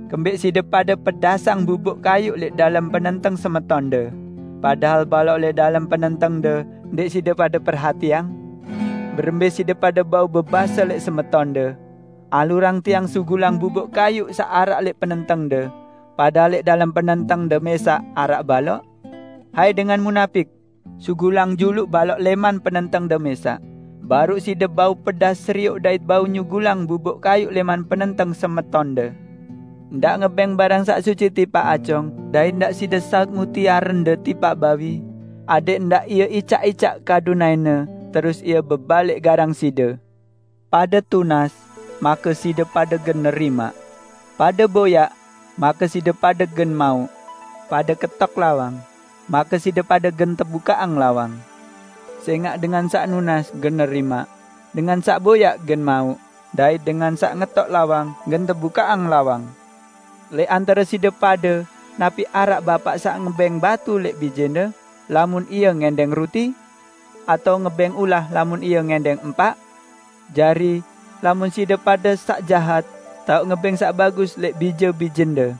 Kembẽq side pade pedasang bubuk kayuq lẽq dalem penenteng semetonde, padahal balok lẽq dalem penentengde, ndẽq side pade perhatiang? Berembẽ side pade bau bebase lẽq semetonde, 'Alurang tiang sugulang bubuk kayuq saq araq lẽq penentengde,' padahal lẽq dalem penentengde mẽsaq araq balok? Hai dengan munapik! Sugulang juluq balok lẽman penentengde mẽsaq, baruq side bau pedas serioq dait bau nyugulang bubuk kayuq lẽman penenteng semetonde. Ndaq ngebẽng barang saq suci tipaq acong, dait ndaq side saut mutiarende tipaq bawi, adẽq ndaq ie icaq-icaq kadu naẽne terus ie bebalik garang side." "Pade tunas, make side pade gen nerimaq. Pade boyaq, make side pade gen mauq. Pade ketok lawang, make side pade gen tebukaqang lawang. Sẽngaq dengan saq nunas gen nerimaq; dengan saq boyaq gen mauq; dait dengan saq ngetok lawang, gen tebukaqang lawang. Lẽq antare side pade napi araq bapaq saq ngebẽng batu lẽq bijene, lamun ie ngẽndẽng ruti? Atao ngebẽng ulah lamun ie ngẽndẽng empaq? Jari, lamun side pade saq jahat, tao ngebẽng saq bagus lẽq bije-bijende.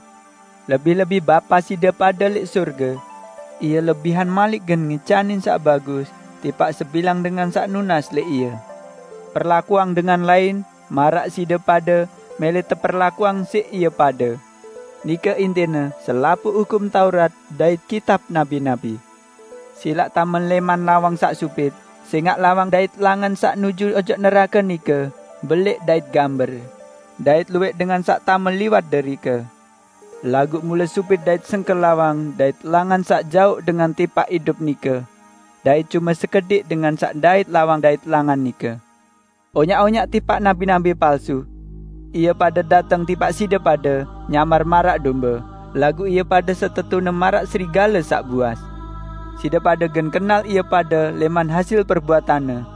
Lebih-lebih Bapa side pade lẽq sorge! Ie lebihan malik gen ngicanin saq bagus tipaq sebilang dengan saq nunas lẽq Ie. Perlakuang dengan lain maraq side pade mẽlẽ teperlakuang siq ie pade. Nike intine selapuq Hukum Taurat dait kitab nabi-nabi." "Silaq tame lẽman lawang saq supit, sẽngaq lawang dait langan saq nuju ojok nerake nike belẽq dait gamber, dait luwẽq dengan saq tame liwat derike. Laguq mule supit dait sengke lawang dait langan saq jauq dengan tipaq idup nike. Dait cume sekediq dengan saq ndait lawang dait langan nike." "Onyaq-onyaq tipaq nabi-nabi palsu. Ie pade dateng tipaq side pade nyamar maraq dombe, laguq ie pade setetune maraq serigale saq buas. Side pade gen kenal ie pade lẽman hasil perbuatanne.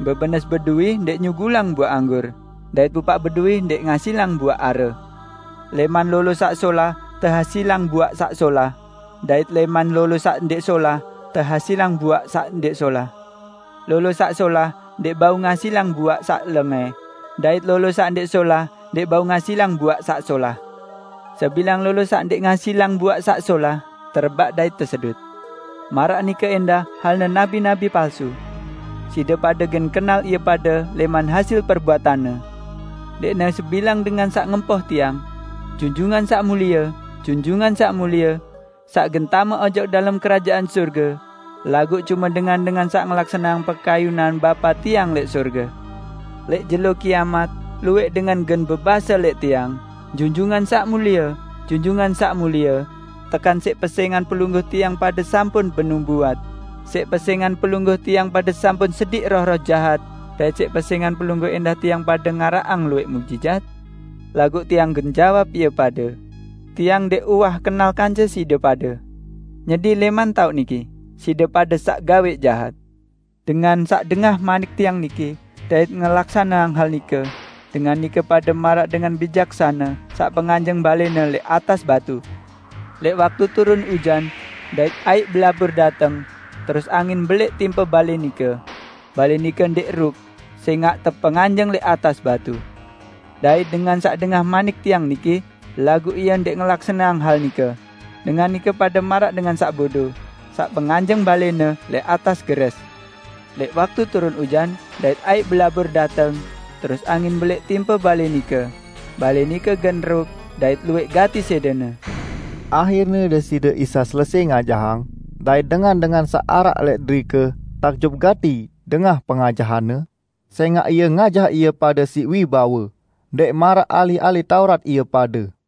Bebenes bedui ndẽq nyugulang buaq anggur, dait pupaq bedui ndẽq ngasilang buaq are. Lẽman lolo saq solah tehasilang buaq saq solah. Dait lẽman lolo saq ndẽq solah tehasilang buaq saq ndẽq solah. Lolo saq solah ndẽq bau ngasilang buaq saq lengẽ, dait lolo saq ndẽq solah ndẽq bau ngasilang buaq saq solah. Sebilang lolo saq ndẽq ngasilang buaq saq solah, terebaq dait tesedut. Maraq nike ẽndah halne nabi-nabi palsu. Side pade gen kenal ie pade lẽman hasil perbuatanne." "Ndẽqne sebilang dengan saq ngempoh Tiang, 'Junjungan Saq Mulie, Junjungan Saq Mulie,' saq gen tame ojok dalem Kerajaan Sorge, laguq cume dengan-dengan saq ngelaksaneang pekayunan Bapa Tiang lẽq sorge. Lẽq jelo kiamat, luwẽq dengan gen bebase lẽq Tiang, 'Junjungan Saq Mulie, Junjungan Saq Mulie, tekan siq pesẽngan Pelungguh tiang pade sampun benubuat, siq pesẽngan Pelungguh tiang pade sampun sediq roh-roh jahat dait siq pesẽngan Pelungguh ẽndah tiang pade ngaraqang luwẽq muqjizat?' Laguq Tiang gen jawab ie pade, 'Tiang ndẽq uwah kenal kance side pade. Nyedi lẽman taoq niki! Side pade saq gawẽq jahat!' " "Dengan saq dengah manik Tiang niki dait ngelaksaneang hal nike, dengan nike pade maraq dengan bijaksane saq penganjeng balẽne lẽq atas batu. Lẽq waktu turun ujan, dait aiq belabur dateng terus angin belẽq timpe balẽ nike, balẽ nike ndẽq ruk sẽngaq tepenganjeng lẽq atas batu. Dait dengan saq dengah manik Tiang niki laguq ie ndẽq ngelaksaneang hal nike, dengan nike pade maraq dengan saq bodo, saq penganjeng balẽne lẽq atas gerẽs. Lẽq waktu turun ujan, dait aiq belabur dateng terus angin belẽq timpe balẽ nike, balẽ nike gen ruk dait luwẽq gati sẽdene!" Ahirne Deside Isa selesẽ ngajahang, dait dengan-dengan saq araq lẽq derike takjub gati dengah pengajahan-Ne, sẽngaq Ie ngajah ie pade siq wibawe, ndẽq maraq ahli-ahli Taurat ie pade.